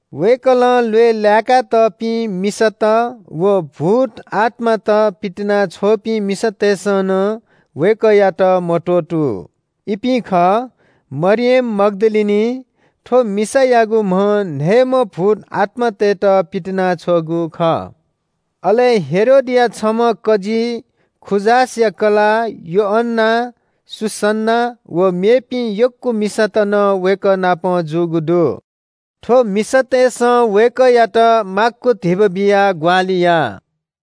वय्‌कलं ल्‍वय् लाय्‌का तःपिं मिसात व भूत आत्‍मात पितिनाछ्वःपिं मिसातय्‌सं नं वय्‌कःयात मत्‍वःतू। इपिं खः – मरियम मग्‍दलिनी (थ्‍व मिसायागु म्‍हं न्‍हय्‌म्‍ह भूतआत्‍मातय्‌त पितिनाछ्वःगु खः) अले हेरोदया छम्‍ह कजी खूजासया कलाः योअन्‍ना, सुसन्‍ना व मेपिं यक्‍व मिसात नं वय्‌कः नाप जूगु दु। थ्‍व मिसातय्‌सं वय्‌कःयात माक्‍व धिबा बियाः ग्‍वाहालि याः।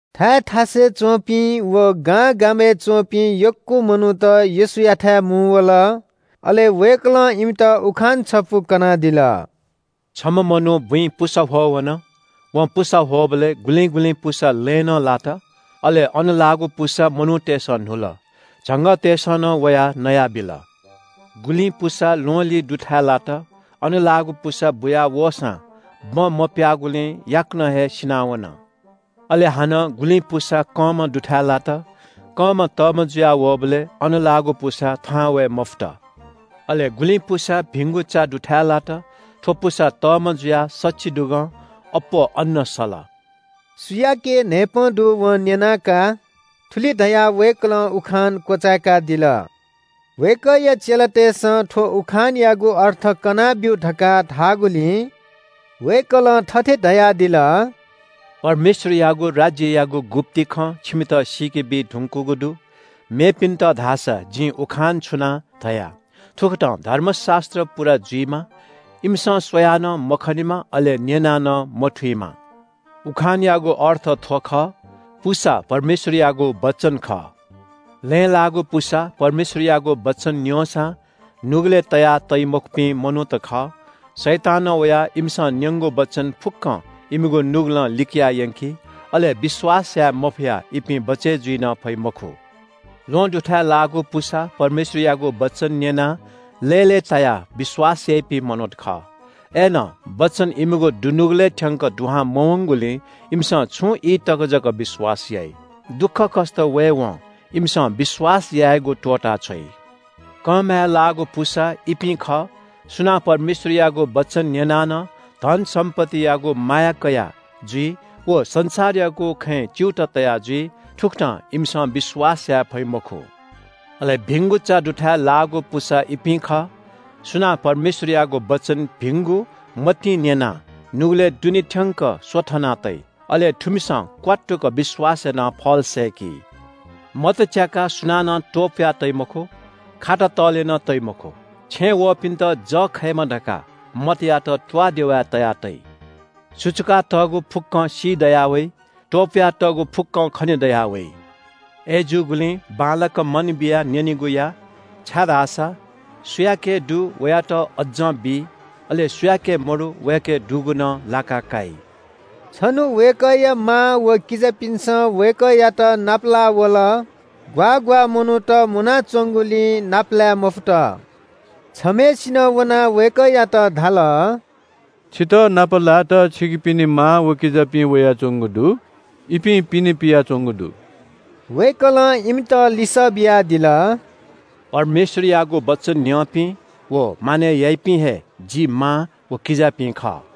थाय् थासय् च्‍वंपिं व गांगामय् च्‍वंपिं यक्‍व मनूत येशूयाथाय् मुंवल। अले वय्‌कलं इमित उखान छपु कनादिल। “छम्‍ह मनू बुँइ पुसा ह्वः वन। वं पुसा ह्वःबलय् गुलिं गुलिं पुसा लँय् नं लात, अले अन लाःगु पुसा मनूतय्‌सं न्‍हुल। झंगःतय्‌सं नं वयाः नयाबिल। गुलिं पुसा ल्‍वहंलिं दुथाय् लात। अन लाःगु पुसा बुयावःसां बँ मप्‍याःगुलिं याकनं हे सिनावन। अले हानं गुलिं पुसा कंमा दुथाय् लात। कंमा तःमा जुया वःबलय् अन लाःगु पुसा थाहां वये मफुत। अले गुलिं पुसा भिंगु चा दुथाय् लात। थ्‍व पुसा तःमा जुयाः सछिदुगं अप्‍वः अन्‍न सल।” सुयाके न्‍हाय्‌पं दु वं न्‍यना का। थुलि धयाः वय्‌कलं उखान क्‍वचाय्‌कादिल। वय्‌कःया चेलातय्‌सं थ्‍व उखानयागु अर्थ कनाब्‍यु धकाः धाःगुलिं वय्‌कलं थथे धयादिल – “परमेश्‍वरयागु राज्‍ययागु गुप्‍ति खँ छिमित सीकेबी धुंकूगु दु। मेपिन्‍त धाःसा जिं उखान छुनाः धया, थुकथं धर्मशास्‍त्र पूरा जुइमा, “‘इमिसं स्‍वयाः नं मखनेमा, अले न्‍यनाः नं मथुइमा।’” “उखानयागु अर्थ थ्‍व खः – पुसा परमेश्‍वरयागु वचन खः। लँय् लाःगु पुसा परमेश्‍वरयागु वचन न्‍यंसां नुगलय् तयातइमखुपिं मनूत खः। शैतानं वयाः इमिसं न्‍यंगु वचन फुक्‍कं इमिगु नुगलं लिकया यंकी, अले विश्‍वास याये मफयाः इपिं बचय् जुइ नं फइ मखु। ल्‍वहं दुथाय् लाःगु पुसा परमेश्‍वरयागु वचन न्‍यनाः लय्‌लय्‌तायाः विश्‍वास याइपिं मनूत खः। अय्‌नं वचन इमिगु दुनुगलय् थ्‍यंक दुहां मवंगुलिं इमिसं छुं ई तक जक विश्‍वास याइ। दुःखकष्‍ट वयेवं इमिसं विश्‍वास यायेगु त्‍वःताछ्वइ। कंमाय् लाःगु पुसा इपिं खः सुनां परमेश्‍वरयागु वचन न्‍यनाः नं धन सम्‍पत्तियागु माया कयाजुइ व संसारयागु खँय् च्‍यूताः तया जुइ। थुकथं इमिसं विश्‍वास याये फइ मखु। अले भिंगु चा दुथाय् लाःगु पुसा इपिं खः – सुनां परमेश्‍वरयागु वचन भिंगु मतिं न्‍यनाः नुगलय् दुने थ्‍यंक स्‍वथना तइ। अले थुमिसं क्‍वात्तुक विश्‍वास यानाः फल सय्‌की।” “मत च्‍याकाः सुनानं त्‍वपुया तइ मखु, खाता तःले नं तइ मखु। छेँय् वःपिन्‍त जः खयेमा धकाः मतयात त्‍वाःदेवाय् तया तइ। सुचुकातःगु फुक्‍कं सीदयावइ। त्‍वपुयातःगु फुक्‍कं खने दयावइ। “अय्‌जूगुलिं बांलाक मन बियाः न्‍यनेगु या, छाय्‌धाःसा सुयाके दु वयात अज्‍जं बी। अले सुयाके मदु, वयाके दुगु नं लाका काइ।” छन्‍हु वय्‌कःया मां व किजापिन्‍सं वय्‌कःयात नापलाः वल। ग्‍वाः ग्‍वाः मनूत मुनाच्‍वंगुलिं नापलाये मफुत। छम्‍हय्‌सिनं वनाः वय्‌कःयात धाल – “छितः नापलायेत छिकपिनि मां व किजापिं वयाच्‍वंगु दु। इपिं पिने पियाच्‍वंगु दु।” वय्‌कलं इमित लिसः बियादिल – “परमेश्‍वरयागु वचन न्‍यंपिं व मानय् याइपिं हे जि मां व किजापिं खः।”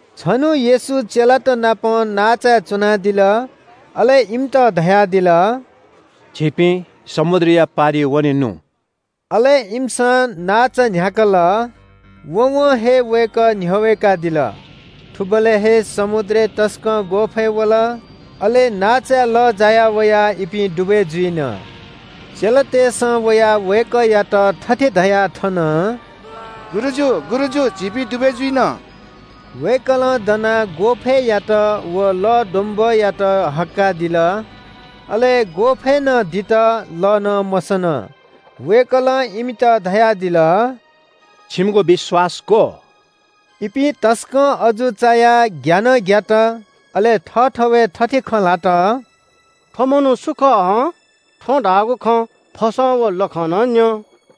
छन्‍हु येशू चेलात नाप नांचाय् च्‍वनादिल। अले इमित धयादिल – “झीपिं समुद्रया पारिइ वनेनु।” अले इमिसं नांचा न्‍ह्याकल। वँवं हे वय्‌कः न्‍ह्यः वय्‌कादिल। थुबलय् हे समुद्रय् तसकं ग्‍वःफय् वल। अले नांचाय् लः जाया वयाः इपिं दुबय् जुइन। चेलातय्‌सं वयाः वय्‌कःयात थथे धयाः थन – “गुरुजु, गुरुजु, झीपिं दुबय् जुइन।” वय्‌कलं दनाः ग्‍वःफय्‌यात व लःद्वम्‍बःयात हक्‍काः दिल। अले ग्‍वःफय् नं दित, लः नं मसन। वय्‌कलं इमित धयादिल – “छिमिगु विश्‍वास ग्‍व?” इपिं तसकं अजू चायाः ग्‍या नं ग्‍यात। अले थःथवय् थथे खँ ल्‍हात – “थ्‍व मनू सु खः हं? थ्‍वं धाःगु खँ फसं व लखं नं न्‍यं।”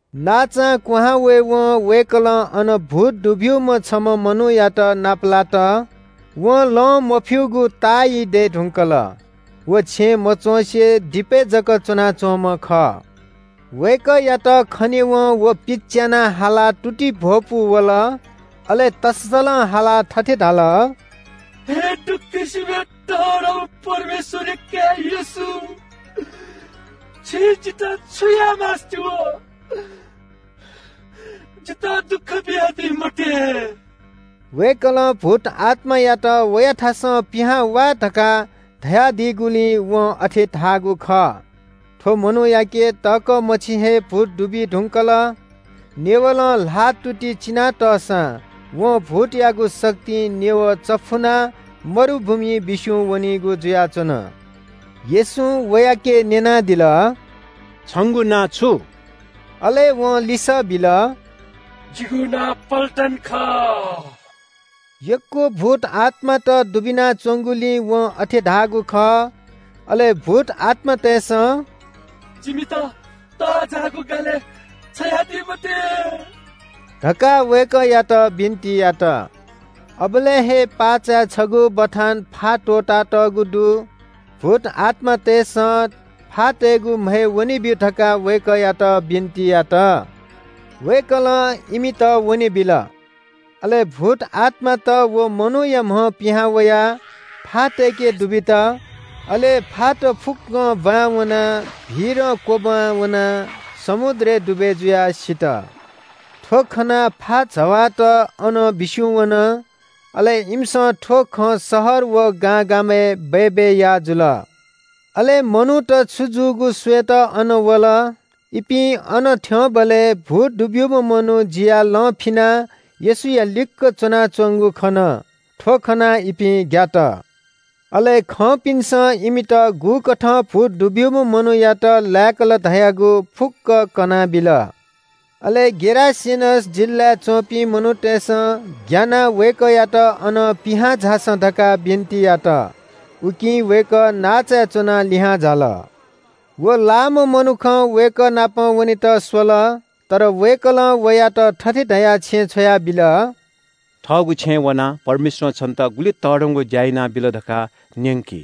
नांचां क्‍वहां वयेवं वय्‌कलं अन भूत दुब्‍यूम्‍ह छम्‍ह मनूयात नापलात। वं लं मफ्‍यूगु ताःई दये धुंकल। व छेँय् मच्‍वँसे दिपय् जक च्‍वनाच्‍वंम्‍ह खः। वय्‌कःयात खनेवं व पिच्‍याना हालाः तुतिइ भ्‍वपू वल। अले तःसलं हालाः थथे धाल – “हे दक्‍वसिबय् तःधंम्‍ह परमेश्‍वरया काय् येशू, छिं जितः छु याये मास्‍ति वः? जितः दुःख बियादी मते।” वय्‌कलं भूतआत्‍मायात – “वयाथासं पिहां वा” धकाः धयादीगुलिं वं अथे धाःगु खः। थ्‍व मनूयाके तःकः मछि हे भूत दुबी धुंकल। नेवलं ल्‍हाःतुति चिनातःसां वं भूतयागु शक्तिं नेवः चफुनाः मरुभूमिइ बिस्‍युं वनीगु जुयाच्‍वन। येशूं वयाके न्‍यनादिल – “छंगु नां छु?” अले वं लिसः बिल – “जिगु नां पल्‍टन खः।” यक्‍व भूत आत्‍मात दुबिना च्‍वंगुलिं वं अथे धाःगु खः। अले भूत आत्‍मातय्‌सं “जिमित तःजाःगु गालय् छ्वयादी मते” धकाः वय्‌कःयात बिन्‍ति यात। अबलय् हे पाःचाय् छगू बथां फा त्‍वःतातःगु दु। भूत आत्‍मातय्‌सं फातय्‌गु म्‍हय् वनेब्‍यु धकाः वय्‌कःयात बिन्‍ति यात। वय्‌कलं इमित वनेबिल। अले भूत आत्‍मात व मनूया म्‍हं पिहां वयाः फातय्‌के दुबित। अले फात फुक्‍कं ब्‍वाँय् वनाः भीरं क्‍वब्‍वां वनाः समुद्रय् दुबय् जुयाः सित। थ्‍व खनाः फा जवाःत अनं बिस्‍युं वन। अले इमिसं थ्‍व खँ शहर व गांगामय् बय्‌बय् याः जुल। अले मनूत छु जूगु स्‍वयेत अन वल। इपिं अन थ्‍यंबलय् भूत दुब्‍यूम्‍ह मनू जियाः लं फिनाः येशूया लिक्‍क च्‍वनाच्‍वंगु खन। थ्‍व खनाः इपिं ग्‍यात। अले खंपिन्‍सं इमित गुकथं भूत दुब्‍यूम्‍ह मनूयात लाय्‌कल धयागु फुक्‍क कनाबिल। अले गेरासेनस जिल्‍लाय् च्‍वंपिं मनूतय्‌सं ग्‍यानाः वय्‌कःयात अनं पिहां झासँ धकाः बिन्‍ति यात। उकिं वय्‌कः नांचाय् च्‍वनाः लिहां झाल। व लाःम्‍ह मनुखं वय्‌कः नाप वनेत स्‍वल, तर वय्‌कलं वयात थथे धयाः छेँय् छ्वयाबिल – “थःगु छेँय् वनाः परमेश्‍वरं छन्‍त गुलि तःधंगु ज्‍या यानाबिल धकाः न्‍यंकि।”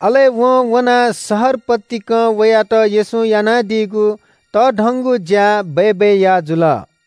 अले वं वनाः शहर पतिकं वयात येशूं यानादीगु तःधंगु ज्‍या बय्‌बय् याः जुल।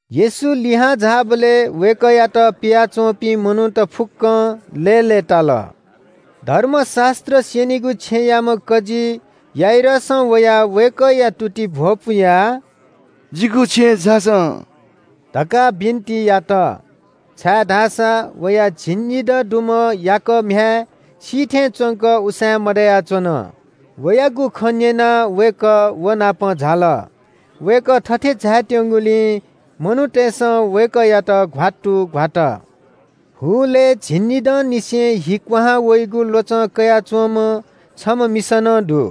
येशू लिहां झाःबलय् वय्‌कःयात पियाच्‍वंपिं मनूत फुक्‍कं लय्‌लय्‌ताल। धर्मशास्‍त्र स्‍यनीगु छेँयाम्‍ह कजी याइरसं वयाः वय्‌कःया तुतिइ भ्‍वपुयाः “जिगु छेँय् झासँ” धकाः बिन्‍ति यात, छाय्‌धाःसा वया झिंनिदँ दुम्‍ह याकः म्‍ह्याय् सी थें च्‍वंक उसाँय् मदयाच्‍वन। वयागु खँ न्‍यनाः वय्‌कः व नाप झाल। वय्‌कः थथे झायेत्‍यंगुलिं मनूतय्‌सं वय्‌कःयात घ्‍वात्तु घ्‍वात। हुलय् झिंनिदंनिसें हि क्‍वहां वइगु ल्‍वचं कयाच्‍वंम्‍ह छम्‍ह मिसा नं दु।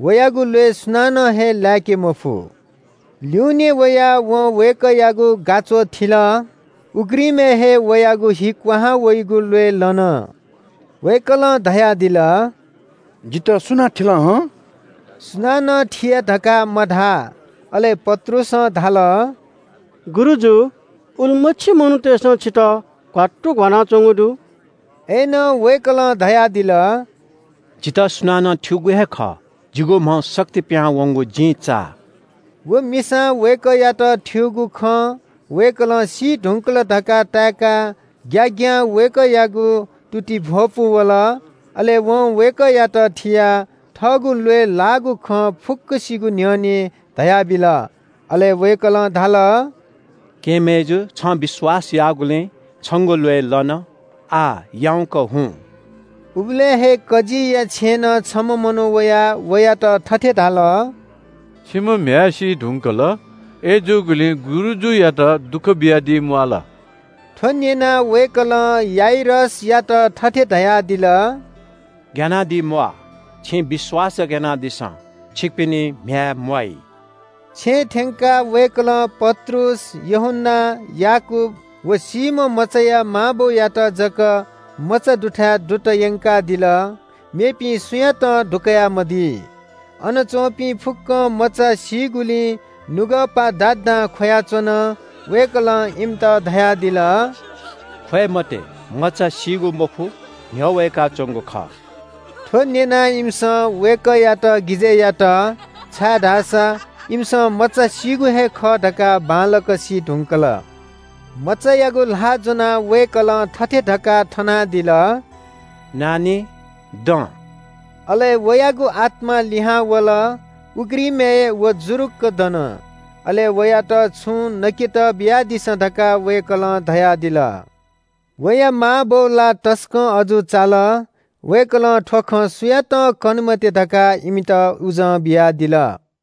वयागु ल्‍वय् सुनानं हे लाय्‌के मफु। ल्‍यूनें वयाः वं वय्‌कःयागु गाच्‍वः थिल। उघ्रिमय् हे वयागु हि क्‍वहां वइगु ल्‍वय् लन। वय्‌कलं धयादिल – “जितः सुनां थिल हं?” सुनानं थिया धकाः मधाः। अले पत्रुसं धाल – “गुरुजु, उलिमछि मनूतय्‌सं छितः घ्‍वात्तु घ्‍वानाच्‍वंगु दु।” अय्‌नं वय्‌कलं धयादिल – “जितः सुनानं थ्‍यूगु हे खः। जिगु म्‍हं शक्ति पिहां वंगु जिं चाः।” व मिसां वय्‌कःयात थ्‍यूगु खँ वय्‌कलं सी धुंकल धकाः ताय्‌काः ग्‍याग्‍यां वय्‌कःयागु तुतिइ भ्‍वपू वल। अले वं वय्‌कःयात थियाः थःगु ल्‍वय् लाःगु खँ फुक्‍कसिगु न्‍ह्यःने धयाबिल। अले वय्‌कलं धाल – “केहेँ मय्‌जु, छं विश्‍वास याःगुलिं छंगु ल्‍वय् लन। आः याउँक हुँ।” उबलय् हे कजीया छेँनं छम्‍ह मनू वयाः वयात थथे धाल – “छिम्‍ह म्‍ह्याय् सी धुंकल, अय्‌जूगुलिं गुरुजुयात दुःख बियादी म्‍वाःल।” थ्‍व न्‍यनाः वय्‌कलं याइरसयात थथे धयादिल – “ग्‍यानादी म्‍वाः, छिं विश्‍वास जक यानादिसँ। छिकपिनि म्‍ह्याय् म्‍वाइ।” छेँय् थ्‍यंकाः वय्‌कलं पत्रुस, यूहन्‍ना, याकूब व सीम्‍ह मचाया मां बौयात जक मचा दुथाय् दुत यंकादिल। मेपिं सुयातं दुकयामदी। अन च्‍वंपिं फुक्‍कं मचा सीगुलिं नुगःपा दादां ख्‍वयाच्‍वन। वय्‌कलं इमित धयादिल – “ख्‍वये मते। मचा सीगु मखु, न्‍ह्यः वय्‌काच्‍वंगु खः।” थ्‍व न्‍यनाः इमिसं वय्‌कःयात गिजय् यात, छाय्‌धाःसा इमिसं मचा सीगु हे खः धकाः बांलाक सी धुंकल। मचायागु ल्‍हाः ज्‍वनाः वय्‌कलं थथे धकाः थनादिल – “नानी, दँ।” अले वयागु आत्‍मा लिहां वल, उघ्रिमय् व जुरुक्‍क दन। अले वयात छुं नकेत बियादिसँ धकाः वय्‌कलं धयादिल। वया मांबौ ला तसकं अजू चाल। वय्‌कलं थ्‍व खँ सुयातं कने मते धकाः इमित उजं बियादिल।